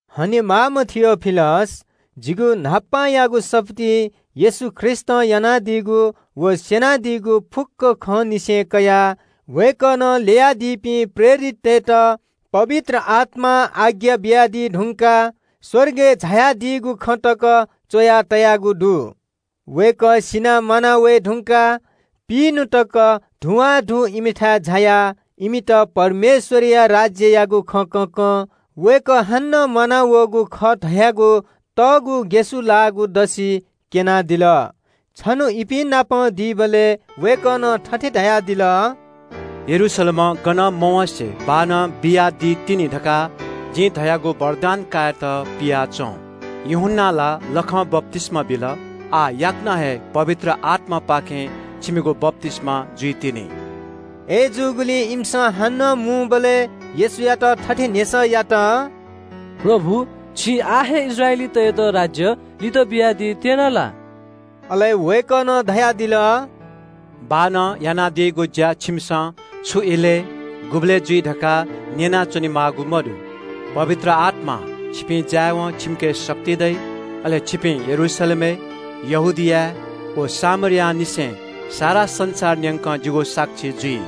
हनेमाःम्‍ह थियोफिलस, जिगु न्‍हापांयागु सफुलिइ येशू ख्रीष्‍टं यानादीगु व स्‍यनादीगु फुक्‍क खंनिसें कयाः वय्‌कलं ल्‍ययादीपिं प्रेरिततय्‌त पवित्र आत्‍मां आज्ञा बियादी धुंकाः स्‍वर्गय् झायादीगु खँ तक च्‍वयागु दु। दुःख सीधुंकाः वय्‌कलं पिइन्‍हु तक धुवांधु इमिथाय् झायाः इमित परमेश्‍वरया राज्‍ययागु खँ कँकं वय्‌कः हानं म्‍वानावःगु खः धयागु यक्‍व ग्‍यसुलाःगु दसि क्‍यनादिल। छन्‍हु इपिं नाप नयेत फ्‍यतुनादीबलय् वय्‌कलं थथे धयादिल – “यरूशलेमं गनं मवँसे बाःनं बियादीतिनि धकाः जिं धयागु वरदान कायेत पियाच्‍वँ। यूहन्‍नां ला लखं बप्‍तिस्‍मा बिल, आः याकनं हे पवित्र आत्‍मापाखें छिमिगु बप्‍तिस्‍मा जुइतिनि।” अय्‌जूगुलिं इमिसं हानं मुंबलय् येशूयात थथे न्‍ह्यसः यात – “प्रभु, छिं आः हे इस्राएलीतय्‌त राज्‍य लित बियादीत्‍यना ला?” अले वय्‌कलं धयादिल – “बाःनं यानादीगु ज्‍या छिमिसं छु इलय्, गुबलय् जुइ धकाः न्‍यना च्‍वनेमाःगु मदु। पवित्र आत्‍मां छिपिं जायेवं छिमिके शक्ति दइ। अले छिपिं यरूशलेमय्, यहूदियाय् व सामरियांनिसें सारा संसार न्‍यंक जिगु साक्षी जुइ।”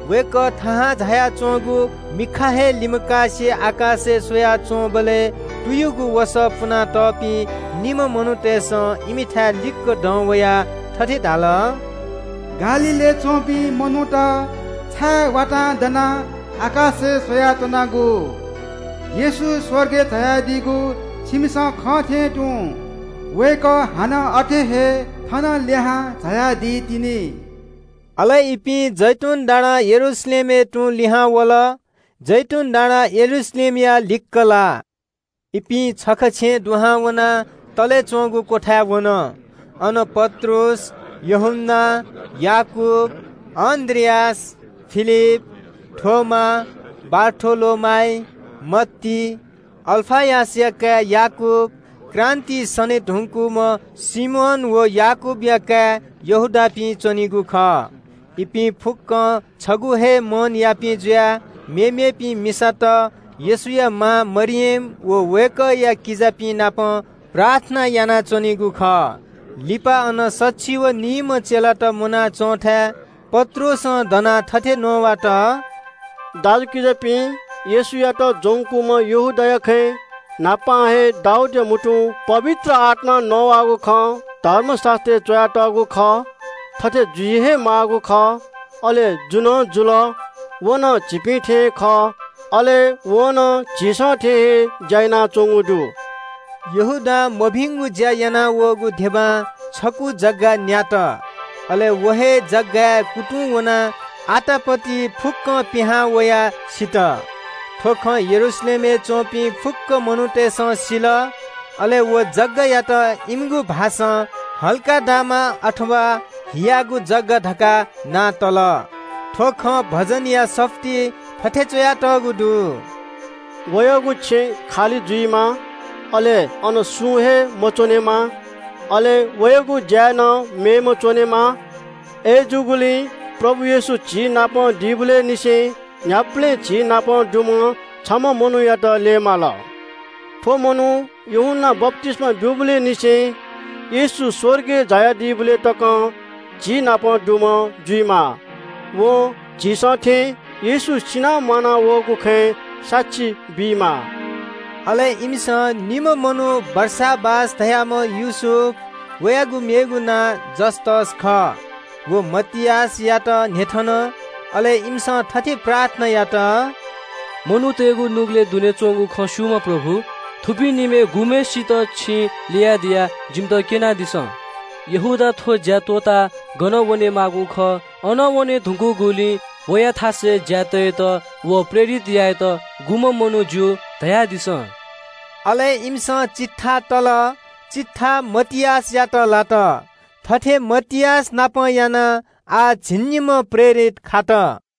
वय्‌कः थाहां झायाच्‍वंगु मिखा हे लिमकासे आकाशय् स्‍वयाच्‍वंबलय् तुयुगु वसः पुनातःपिं निम्‍ह मनूतय्‌सं इमिथाय् लिक्‍क दं वयाः थथे धाल – “गालीलय् च्‍वंपिं मनूत, छाय् वातां दनाः आकाशय् स्‍वयाच्‍वनागु? येशू स्‍वर्गय् झायादीगु छिमिसं खंथें तुं वय्‌कः हानं अथे हे थन लिहां झायादी तिनि।” अले इपिं जैतून डाँडां यरूशलेमय् तुं लिहां वल। जैतून डाँडां यरूशलेम छगू किलोमिटर ति तापाः। शहरय् वयेवं इपिं छखा छेँय् दुहां वनाः तले च्‍वंगु क्‍वथाय् वन। अन पत्रुस, यूहन्‍ना, याकूब, अन्‍द्रियास, फिलिप, थोमा, बारथोलोमाइ, मत्ती, अल्‍फयसया काय् याकूब, क्रान्‍तिइ सने धुंकूम्‍ह सिमोन व याकूबया काय् यहूदापिं च्‍वनीगु खः। इपिं फुक्‍कं छगू हे मनयापिं जुयाः मेमेपिं मिसात, येशूया मां मरियम व वय्‌कःया किजापिं नाप प्रार्थना यानाच्‍वनीगु खः। लिपा अन सछि व निइम्‍ह चेलात मुनाच्‍वंथाय् पत्रुसं दनाः थथे नवात – “दाजुकिजापिं, येशूयात ज्‍वंकूम्‍ह यहूदाया खँय् न्‍हापां हे दाऊदया म्‍हुतुं पवित्र आत्‍मां नवाःगु खँ धर्मशास्‍त्रय् च्‍वयातःगु खः। थथे जुइ हे माःगु खः, अले जु नं जुल। व नं झीपिं थें खः, अले वं नं झीसं थें हे ज्‍या यानाच्‍वंगु खः।” यहूदां मभिंगु ज्‍या यानावःगु धिबां छकू जग्‍गा न्‍यात। अले व हे जग्‍गाय् कुतुं वनाः आतापति फुक्‍कं पिहां वयाः सित। थ्‍व खँ यरूशलेमय् च्‍वंपिं फुक्‍क मनूतय्‌सं सिल। अले व जग्‍गायात इमिगु थःगु भाषां “हकल्‍दामा”, अथवा “हियागु जग्‍गा” धकाः नां तल। “थ्‍व खँ भजनया सफुलिइ थथे च्‍वयातःगु दु – “‘वयागु छेँ खालि जुइमा, अले अन सुं हे मच्‍वनेमा।’ ‘वयागु थाय् नं मेम्‍हय्‌सिनं कायेमा।’ “अय्‌जूगुलिं प्रभु येशू झीनाप दीबलय् निसें न्‍ह्याबलें झीनाप दुम्‍ह छम्‍ह मनूयात ल्‍यये माल। थ्‍व मनू यूहन्‍नां बप्‍तिस्‍मा ब्‍यूबलय् निसें येशू स्‍वर्गय् झायादीबलय् तकं झीनाप दुम्‍ह जुइमाः। वं झीसं थें येशू सिनाः म्‍वानावःगु खँय् साक्षी बीमाः।” अले इमिसं निम्‍ह मनू बारसाबास धाःम्‍ह योसेफ, (वयागु मेगु नां युस्‍तस खः) व मतियासयात न्‍ह्यथन। अले इमिसं थथे प्रार्थना यात – “मनूतय्‌गु नुगलय् दुने च्‍वंगु खँ स्‍यूम्‍ह प्रभु, थुपिं निम्‍हय् गुम्‍हय्‌सित छिं ल्‍ययादिया, जिमित क्‍यनादिसँ। यहूदा थ्‍व ज्‍या त्‍वःताः गन वनेमाःगु खः अन वने धुंकूगुलिं वया थासय् ज्‍याय् तयेत व प्रेरित यायेत गुम्‍ह मनू ज्‍यू, धयादिसँ?” अले इमिसं चिट्ठा तल, चिट्ठा मतियासयात लात। थथे मतियासनापं यानाः आः झिंनिम्‍ह प्रेरित खात।